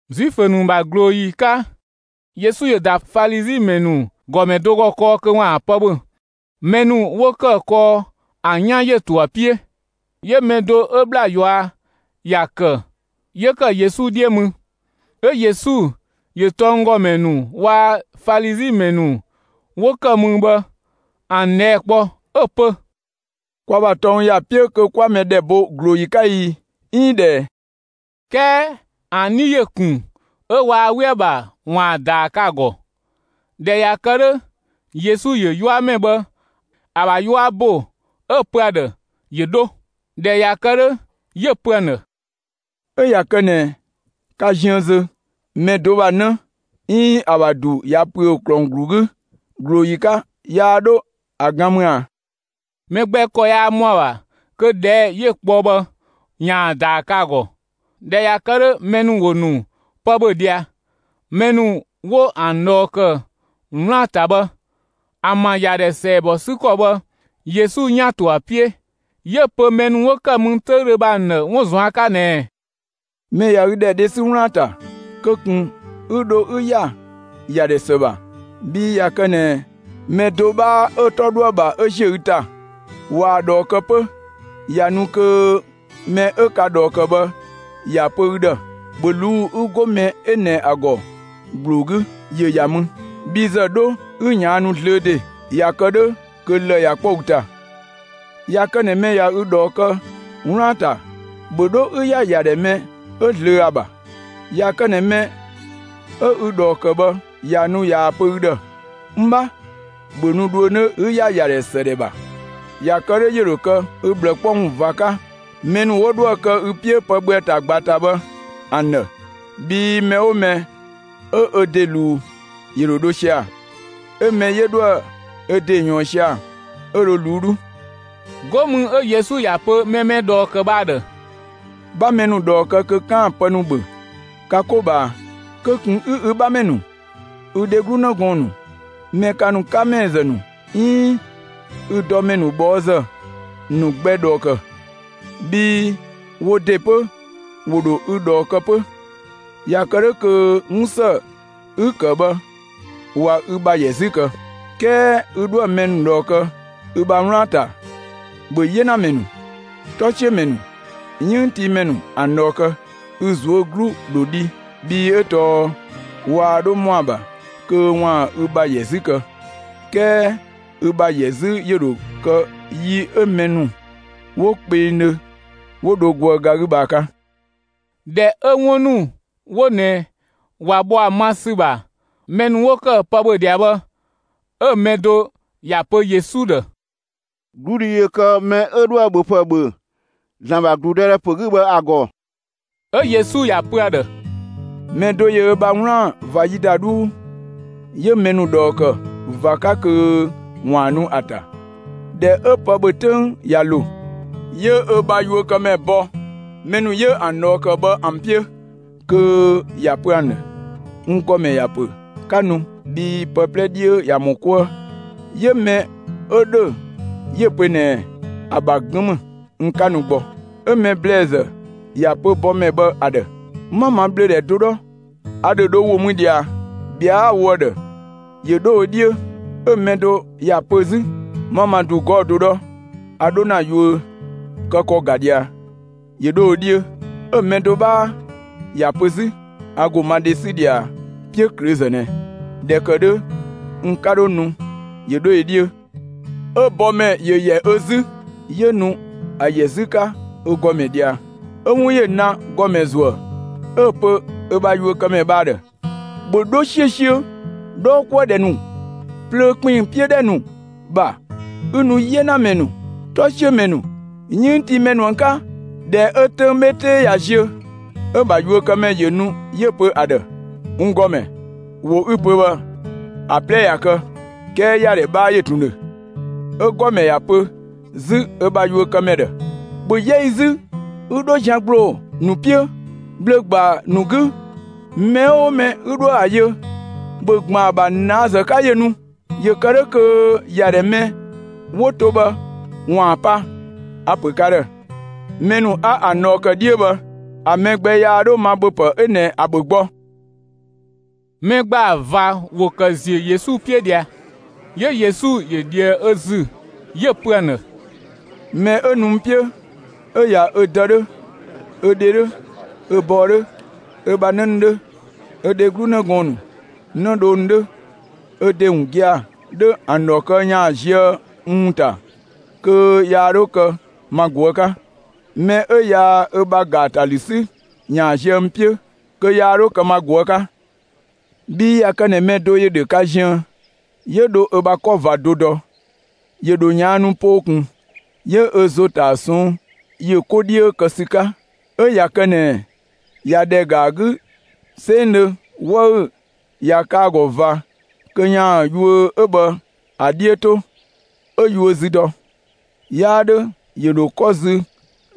Zuifö ‑nu ‑bha ꞊glooyi 'ka, Yesu ‑yö ‑da Falizi ‑mɛ ‑nu ‑gɔmɛ do ‑gɔ kɔɔ kö ‑waan pë ‑bhö. Mɛ ‑nu 'wo ‑kë kɔɔ ‑an 'yan ‑yö to ‑a 'piö. 'Yö mɛ do 'ö ‑bhla ꞊yua' ‑ya ‑kë, 'yö ‑kë Yesu 'dhiö mü. 'Ö Yesu ‑yö tɔnggɔmɛ ‑nu waa‑ Falizi ‑mɛ ‑nu 'wo ‑kë mü bhë ‑an ꞊dhɛɛ' kpɔ 'ö‑ pö: «Kwa ‑bha tɔng ‑ya 'piö kö 'kwa mɛ ‑dhɛ bo ꞊glooyi 'ka i, 'iin ꞊dhë ꞊ɛ?» 'Kɛɛ ‑an 'dhi ‑yö ‑kun 'ö waa 'we ‑a ‑bha ‑waan ‑a ‑daa kë ‑a ‑gɔ. ꞊Dhɛ ꞊ya kë 'dhö, Yesu ‑yö 'yuamɛ bhë ‑a ‑bha 'yua ‑bo 'ö‑ pö ‑a ‑dhë ‑yö 'dho. ꞊Dhɛ ꞊ya kë 'dhö, 'yö‑ pö ‑an ‑dhë: «'Ö ꞊ya kë ꞊nɛ ka ziën zö, mɛ do ‑bha 'në 'iin ‑a ‑bha ‑du ꞊ya ‑püö ‑klɔng ‑glu 'gü ꞊glooyi 'ka, yaa 'dho ‑a gan mü ꞊a?» Mɛ gbɛ ‑kɔ yaa ‑mɔ ‑a ‑bha kö ꞊dhɛɛ' 'yö‑ kpɔ bhë ‑yaan ‑a ‑daa kë ‑a ‑gɔ. ꞊Dhɛ ꞊ya kë 'dhö, mɛ ‑nu ‑wo ‑nu pë ‑bhö ꞊dhia. Mɛ ‑nu 'wo ‑an ꞊dhɔɔ ‑kë 'wlaan‑ ‑ta bhë, ‑an ‑bha ‑yadhɛ ‑sɛɛbɔ 'sü ‑kɔ bhë, Yesu 'yan‑ ‑to ‑a 'piö. 'Yö‑ pö mɛ ‑nu 'wo ‑kë mü 'töüdhö bhë ‑an ‑dhë 'wun ꞊zuan' 'ka ꞊nɛɛ: «Mɛ ꞊ya ü ‑dhɛ dhe 'sü 'wlaan‑ ‑ta, kö ꞊kun 'ü dho 'ü ‑ya ‑yadhɛ ‑së ‑bha, bhii ꞊ya kë ꞊nɛ mɛ do 'bhaa 'ö‑ 'tɔ 'dhö ‑a ‑bha 'ö ꞊zië' ü ‑ta, ꞊waa‑ ꞊dhɔɔ kë 'pö, ꞊ya nu kö mɛ 'ö ka ꞊dhɔɔ ‑kë bhë ‑ya pö ü ‑dhë: ‹‑Bhö ꞊luu'‑ 'ü 'go mɛ ꞊nɛ ‑a ‑gɔ ‑gbloo 'gü, ‑yö ‑ya mü, bhi ‑zë 'dho 'ü ꞊yaannu zlöö ‑de!› ꞊Ya kë 'dhö kö lë‑ ꞊ya 'kpɔ ü ‑ta. ꞊Ya kë ꞊nɛ ꞊wa ü ꞊dhɔɔ kë 'wlaan‑ ‑ta, ‑bhö 'dho 'ü ‑ya ‑yadhɛ mɛ 'ö zlöö ‑a ‑bha. ꞊Ya kë ꞊nɛ mɛ 'ö ü ꞊dhɔɔ ‑kë bhë ꞊ya nu ꞊yaa‑ pö ü ‑dhë: ‹N 'bha, ‑bhö nu dhuö 'nö 'ü ‑ya ‑yadhɛ ‑së ‑dhɛ ‑bha!› ꞊Ya kë 'dhö ‑yö ‑dho kë ü ꞊bhlë 'kpɔ ‑wun ꞊va 'ka, mɛ ‑nu 'wo 'dhoë‑ kë ü 'piö pë ‑bhö ‑a ‑ta ꞊gba ‑ta bhë ‑an ‑dhë. Bhii mɛ 'oo mɛ 'ö ö ‑de ꞊luu', ‑yö ‑dho dho sia‑; 'ö mɛ 'yö 'dhoë‑ ö ‑de ꞊yɔɔn sia‑, 'ö dho ꞊luu'‑ 'dhuu.» 'Go mü 'ö Yesu ‑ya pö mɛ mɛ ꞊dhɔɔ ‑kë bhë ‑a ‑dhë: «'Bha mɛ ‑nu ꞊dhɔɔ kë kö 'kaan‑ pë ‑nu ‑bhö ka 'ko ꞊bhaa, kö ꞊kun 'ü ü 'bhamɛ ‑nu, ü dheglu 'në gɔɔn‑ ‑nu, mɛ ka ‑nu 'ka ‑mɛɛzë ‑nu 'iin ü dɔmɛ ꞊bhɔɔzë ‑nu gbɛ ꞊dhɔɔ ‑kë, bhii wo ‑de 'pö ‑wo ‑dho ü ꞊dhɔɔ kë 'pö; ꞊ya kë 'dhö kö 'wun ‑së 'ü‑ ‑kë bhë ꞊wa ü ‑bha ‑yɛ 'zü kë. 'Kɛɛ ü 'dhoë‑ mɛ ꞊dhɔɔ kë ü bha 'wlaan‑ ‑ta, ‑bhö 'yenamɛ ‑nu, 'tɔsiömɛ ‑nu, 'yënngtiimɛ ‑nu ‑an ꞊dhɔɔ kë. Ü ꞊zuö' 'glu ‑dho dhi, bhii 'ö tɔɔ waa 'dho ‑mɔ ‑a ‑bha kö ‑waan ü ‑bha ‑yɛ 'zü kë, 'kɛɛ ü ‑bha ‑yɛ 'zü ‑yö ‑dho kë yi 'ö mɛ ‑nu 'wo kpengdhö 'wo dho goë ga 'gü bhë ‑a 'ka.» ꞊Dhɛ 'ö 'wun ‑nu 'wo ꞊nɛ ꞊wa bhɔ ‑a ma ‑sü ‑bha, mɛ ‑nu 'wo ‑kë pë ‑bhö ꞊dhia bhë 'ö‑ mɛ do ‑ya pö Yesu ‑dhë: «'Gludhi ‑yö kë mɛ 'ö 'dhoë‑ ‑bhöpë ‑bhö ‑Zlan ‑bha ‑gludëdhɛ ‑pö 'gü bhë ‑a ‑gɔ!» 'Ö Yesu ‑ya pö ‑a ‑dhë: «Mɛ do ‑yö ö bha 'wlaan‑ ꞊va ‑yi ‑da 'dhuu, 'yö mɛ ‑nu ꞊dhɔɔ ‑kë ꞊va 'ka kö ‑waan nu ‑a ‑ta. ꞊Dhɛ 'ö pë ‑bhö 'töng ꞊ya ‑lo, 'yö ö bha yuökëmɛ bɔ mɛ ‑nu 'yö ‑an ꞊dhɔɔ ‑kë bhë ‑an 'piö kö ‑ya pö ‑an ‑dhë: ‹N ‑gɔmɛ ‑ya ‑pö 'ka nu, bhii pë 'plɛ 'dhiö ꞊ya ‑mɔ 'kuë!› 'Ö mɛ 'ö ‑dhö 'yö‑ pö ꞊nɛɛ: ‹‑A ‑bha 'gën ‑mü, n 'ka nu gbɔ.› 'Ö‑ mɛ ‑blɛɛzë ‑ya pö bɔmɛ bhë ‑a ‑dhë: ‹'Ma ma ꞊bhlöödhɛ do 'dhɔ, a ‑dho dho ‑wo mü ꞊dhia, ꞊bhɛa'‑ 'a‑ wo ‑a ‑dhë ‑yö 'dho ö 'dhiö!› 'Ö‑ mɛ do ‑ya pö 'zü: ‹'Ma ma ‑du 'gɔɔ‑ do 'dhɔ, a 'dho ‑na yuö kë ‑kɔ ‑ga ꞊dhia, ‑yö 'dho ö 'dhiö!› 'Ö mɛ do 'bhaa ‑ya pö 'zü: ‹A ‑go ma dhe 'sü ꞊dhia 'piöklöözë ꞊nɛ; ꞊dhɛ ‑kë 'dhö n 'ka 'dho nu, ‑yö 'dho ö 'dhiö!› 'Ö bɔmɛ ‑yö ‑yɛ ö 'zü, 'yö nu ‑a ‑yɛ 'zü 'ka ö ‑gɔmɛ ꞊dhia. 'Ö 'wun ‑yö na ‑gɔmɛ ‑zuë, 'ö‑ pö ö bha yuökëmɛ bhë ‑a ‑dhë: ‹‑Bhö 'dho 'siösiö 'dhɔɔkuëdhɛ ‑nu, plöö ‑kpinng 'piö ‑dhɛ ‑nu ‑bha, 'ü nu 'yenamɛ ‑nu, 'tɔsiömɛ ‑nu, 'yënngtiimɛ ‑nu ‑an 'ka!› ꞊Dhɛ 'ö 'töng 'bhe 'tee ꞊ya ziö, 'ö‑ ‑bha yuökëmɛ ‑yö nu 'yö‑ pö ‑a ‑dhë: ‹N ‑Gɔmɛ, ‑wo 'ü‑ pö bhë, ‑a 'plɛ ꞊ya kë, 'kɛɛ ‑yadhɛ 'bhaa ‑yö ꞊tun ‑dhö.› 'Ö‑ ‑gɔmɛ ‑ya pö 'zü ö bha yuökëmɛ ‑dhë: ‹‑Bhö 'yɛ ü 'zü, 'ü 'dho zian ‑gbloo ‑nu 'piö, bhlö‑ ‑gbaa ‑nu 'gü; mɛ 'oo mɛ 'ü 'dhoë‑ ‑a yö, ‑bhö ‑gban ‑a ‑bha ꞊naazë 'ka ‑yö nu. ‑Yö ‑kë 'dhö kö ‑yadhɛ mɛ 'wo to bhë ‑waan pa. A‑ ‑pö ka ‑dhë: Mɛ ‑nu 'a ‑an ꞊dhɔɔ ‑kë 'dhiö bhë, ‑a mɛ gbɛ yaa 'dho ma ‑bhöpë 'ö ꞊nɛ ‑a ‑bhö gbɔ.›» Mɛ ‑gbaa ꞊va ‑wo ‑kë ‑ziö Yesu 'piö ꞊dhia. 'Yö Yesu ‑yö ꞊dhië ö ‑zü 'yö‑ pö ‑an ‑dhë: «Mɛ 'ö nu n 'piö 'ö ꞊ya ö dë 'dhö, ö dhe 'dhö, ö bɔɔ 'dhö, ö bha 'në ‑nu 'dhö, ö dheglu 'në gɔɔn‑ ‑nu, 'nëdhoo ‑nu 'dhö, ö ‑de ‑wun gia‑ 'dhö ‑an ‑dhɔ kë ‑yaan ziö n ‑wun ‑ta, kö yaa 'dho kë ma ꞊guë' 'ka. Mɛ 'ö yaa ö bha ‑gaatalü 'sü, ‑yaan ziö n 'piö, kö yaa 'dho kë ma ꞊guë' 'ka. Bhii ꞊ya kë ꞊nɛ mɛ do ‑yö ‑dhö ka ziën, 'yö dho ö bha 'kɔ ꞊va do dɔ, ‑yö ‑dho ꞊yaannu poo ꞊kun 'yö ö ‑zo ‑ta ‑a ꞊sɔnng' ‑yö 'ko 'dhiö ‑sü 'ka; 'ö ꞊ya kë ꞊nɛ ꞊ya ‑dhɛ ‑ga ‑a 'gü 'sengdhö 'wëü‑ ꞊ya kë ‑a ‑gɔ ꞊va kö ‑yaan yuö 'ö bhë ‑a 'dhiö 'to, 'ö‑ yuö zü dɔ. 'Yaa 'dhö ‑yö ‑dho 'kɔ zü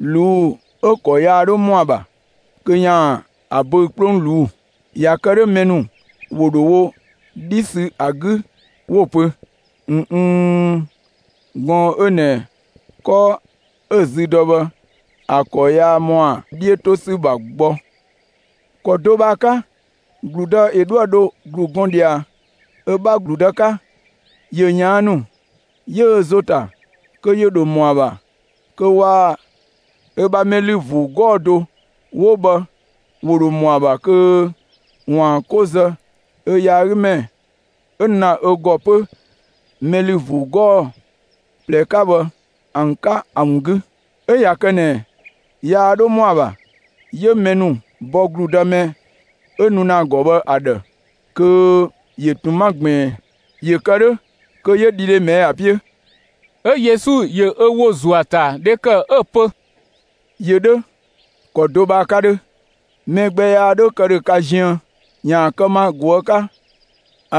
꞊luu'‑, 'ö‑ ‑kɔ yaa 'dho ‑mɔ ‑a ‑bha kö ‑yaan ‑a böü‑ 'kplong ꞊luu'‑. ꞊Ya kë 'dhö mɛ ‑nu ‑wo ‑dho wo 'dhi ‑sü ‑a 'gü 'wo‑ pö: ‹꞊N n, gɔɔn‑ 'ö ꞊nɛ 'kɔ 'ö‑ zü dɔ bhë ‑a ‑kɔ yaa ‑mɔ ‑a 'dhiö 'to ‑sü ‑bha gbɔ!› ‑Kɔ do bhë ‑a 'ka, ‑gludë ‑yö 'dhoë‑ dho ‑glu gɔn ꞊dhia ö 'bha ‑gludë 'ka, ‑yö ꞊yaannu 'yö ö ‑zo ‑ta kö ‑yö ‑dho ‑mɔ ‑a ‑bha kö waa‑ ö bha mɛ ‑lü ‑vuu 'gɔɔ‑ do 'wo bhë ‑wo ‑dho ‑mɔ ‑a ‑bha kö 'waan‑ 'ko zë ö yaagümɛ 'ö nu ‑na ö ‑gɔ 'pö mɛ ‑lü ‑vuu 'gɔɔ‑ ꞊plɛ 'ka bhë ‑an 'ka ‑a ‑wun 'gü. 'Ö ꞊ya kë ꞊nɛ yaa 'dho ‑mɔ ‑a ‑bha, 'yö mɛ ‑nu bɔ ‑gludë mɛ 'ö nu ‑na ‑a ‑gɔ bhë ‑a ‑dhë kö ‑yö ꞊tun 'ma ꞊gbiin; ‑yö kë 'dhö, kö 'yö dhidhe ꞊mɛɛ'‑ ‑a 'piö.» 'Ö Yesu ‑yö ö ‑wo ‑zuö ‑a ‑ta dhe ‑kë, 'ö‑ pö: «‑Yö 'dhö ‑kɔ do bhë ‑a 'ka 'dhö: Mɛ gbɛ yaa 'dho kë ‑dhö ka ziën ‑yaan kë ma ꞊guë' 'ka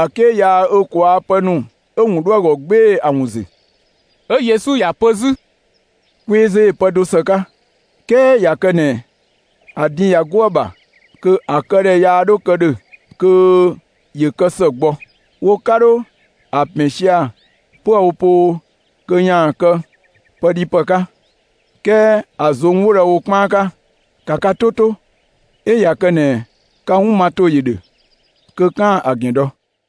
‑a 'ke yaa ö ꞊kwaa' pë ‑nu 'ö‑ ‑wun 'dho ‑a ‑gɔ 'gbee‑ ‑a ‑wun ‑zü.» 'Ö Yesu ‑ya pö 'zü: «Kweezö ‑yö pë do ‑së 'ka, 'kɛɛ ꞊ya kë ꞊nɛ ‑a din ꞊ya 'go ‑a ‑bha kö ‑a këdhɛ yaa 'dho kë ‑dhö kö ‑yö kë ‑së gbɔ. Wo 'ka 'dho ‑a ‑pɛn sia‑ 'püë‑ wo poo kö ‑yaan kë pëdhipë 'ka, 'kɛɛ ‑a ꞊zong' 'wo dho ‑a wo 'kpaan 'ka. ‑Ka ka 'to 'to, 'ö ꞊ya kë ꞊nɛ ka 'wun ma ‑to ‑yö ‑dhö kö 'kaan‑ ‑a ‑gɛn dɔ!»